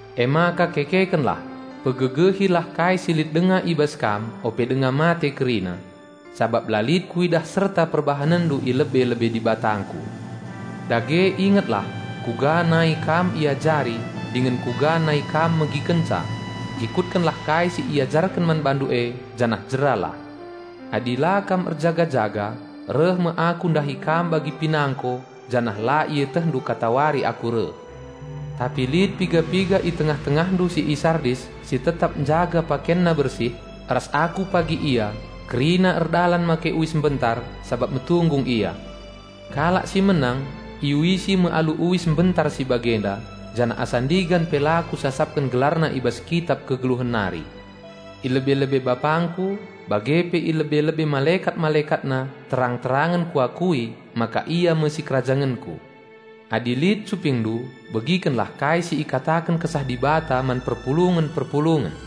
Emaka kekekenlah, pegegehilah kai si lit denga i bas kam ope denga mate kerina. Sabap la lit Kuidah serta perbahanenndu i lebe-lebe DibatangKu. Dage ingetlah kuga nai kam iajari dingen kuga nai kam megikenca. Ikutkenlah kai si iajarken man bandu e, janah jeralah. Adi la kam keke, reh me Aku ndahi kam bagi pinangko, janah la ietehndu katawari Aku reh. Tapi lit piga-piga i tengah-tengahndu si i Sardis si tetap njaga pakenna bersih. Ras Aku pagi ia kerina erdalan make uis mbentar, sabap metunggung ia. Kalak si menang iuisi me alu uis mbentar si bagenda, janah asa ndigan pe la Kusasapken gelarna i bas Kitap Kegeluhen nari. I lebe-lebe BapangKu, bage pe i lebe-lebe malekat-MalekatNa terang-terangen Kuakui maka ia me sikerajangenKu. Adi lit cupingndu begikenlah kai si ikataken Kesah Dibata man perpulungen-perpulungen!"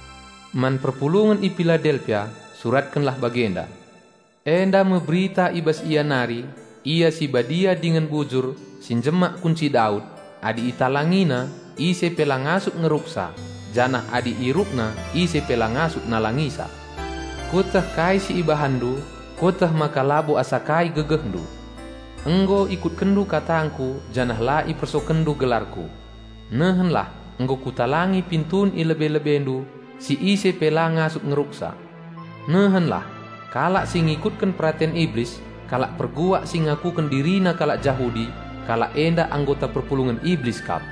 "Man perpulungen i Piladelpia suratkenlah bagenda: Enda me berita i bas Ia nari, Ia si Badia dingen Bujur, si njemak kunci Daud; adi ItalangiNa, ise pe la ngasup ngeruksa, janah adi IerukNa ise pe la ngasup nalangisa. Kueteh kai si ibahanndu. Kueteh maka labo asa kai gegehndu; nggo ikutkenndu katangKu janah la ipersokenndu gelarKu. Nehenlah nggo Kutalangi pintun i lebe-lebendu, si ise pe la ngasup ngeruksa. Nehenlah! Kalak si ngikutken peraten Iblis, kalak perbual si ngakuken dirina kalak Jahudi, kalak enda anggota perpulungen Iblis kap.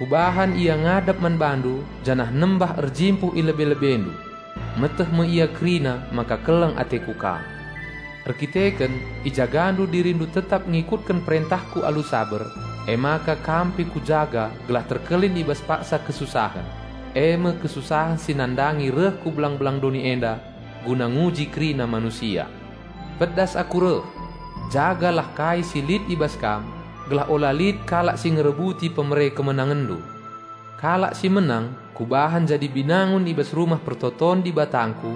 Kubahan ia ngadap man bandu janah nembah erjimpuh i lebe-lebendu. Meteh me ia kerina maka keleng ateKu kam. Erkiteken ijagandu dirindu tetap ngikutken perentahKu guna saber, emaka kam pe Kujaga gelah selamat i bas paksa kesusahen, e me kesusahen si nandangi reh ku belang-belang doni enda, guna nguji kerina manusia. Pedas Aku reh! Jagalah kai si lit i bas kam, gelah ula lit kalak si ngerebuti hadiah kemenangenndu. Kalak si menang Kubahan jadi binangun i bas Rumah Pertoton DibatangKu,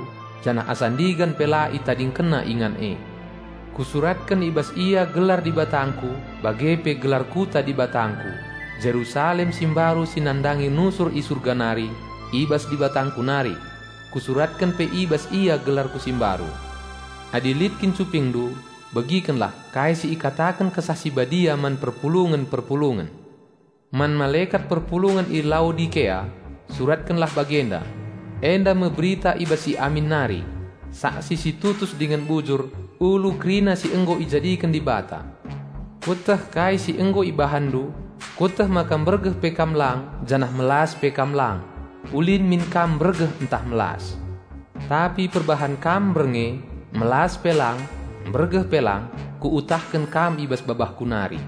janah asa ndigan pe la ItadingkenNa ingan e. Kusuratken i bas ia gelar DibatangKu bage pe gelar Kota DibatangKu, Jerusalem si Mbaru si nandangi nusur i surga nari, i bas DibatangKu nari. Kusuratken pe i bas ia gelarKu si mbaru. Adi lit kin cupingndu, begikenlah kai si ikataken Kesah Si Badia man perpulungen-perpulungen!" "Man malekat perpulungen i Laodikea, suratkenlah bagenda: Enda me berita i bas si Amin nari, saksi si tutus dingen bujur, ulu kerina si nggo ijadiken Dibata. Kueteh kai si nggo ibahanndu. Kueteh maka mbergeh pe kam lang janah melas pe kam lang. Ulin min kam mbergeh ntah melas. Tapi perbahan kam mbernge, melas pe lang, mbergeh pe lang, Kuutahken kam i bas babahKu nari.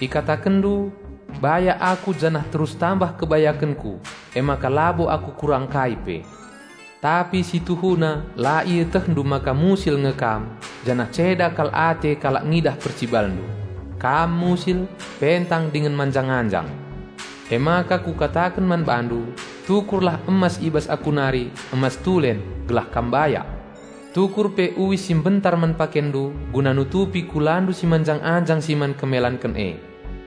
Ikatakenndu, 'Bayak aku janah terus tambah kebayakenku, emaka labo aku kurang kai pe.' Tapi si tuhuna la ietehndu maka musil nge kam janah ceda kal ate kalak ngidah percibalndu. Kam musil, pentang dingen manjang-anjang. Emaka Kukataken man bandu, tukurlah emas i bas aku nari, emas tulen, gelah kam bayak. Tukur pe uis si mbentar man pakenndu, guna nutupi kulandu si manjang-anjang, si man kemelanken e.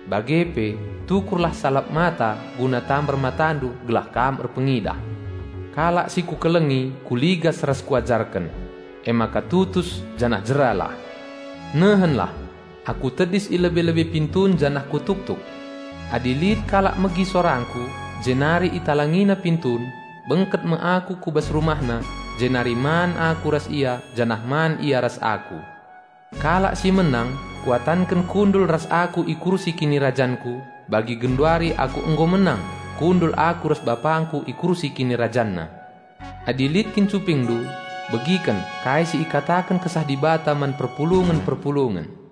Bage pe tukurlah salap mata guna tambar matandu gelah kam erpengidah. Kalak si Kukelengi Kuligas ras Kuajarken. Emaka tutus janah jeralah. Nehenlah! Aku tedis i lebe-lebe pintun janah kutuktuk. Adi lit kalak megi sorangKu jenari italangina pintun, bengket me Aku ku bas rumahna jenari man Aku ras ia janah man ia ras Aku. Kalak si menang Kuatanken kundul ras Aku i kursi KinirajanKu, bagi genduari Aku nggo menang, kundul Aku ras BapangKu i kursi KinirajanNa. Adi lit kin cupingndu begiken kai si ikataken Kesah Dibata man perpulungen-perpulungen!"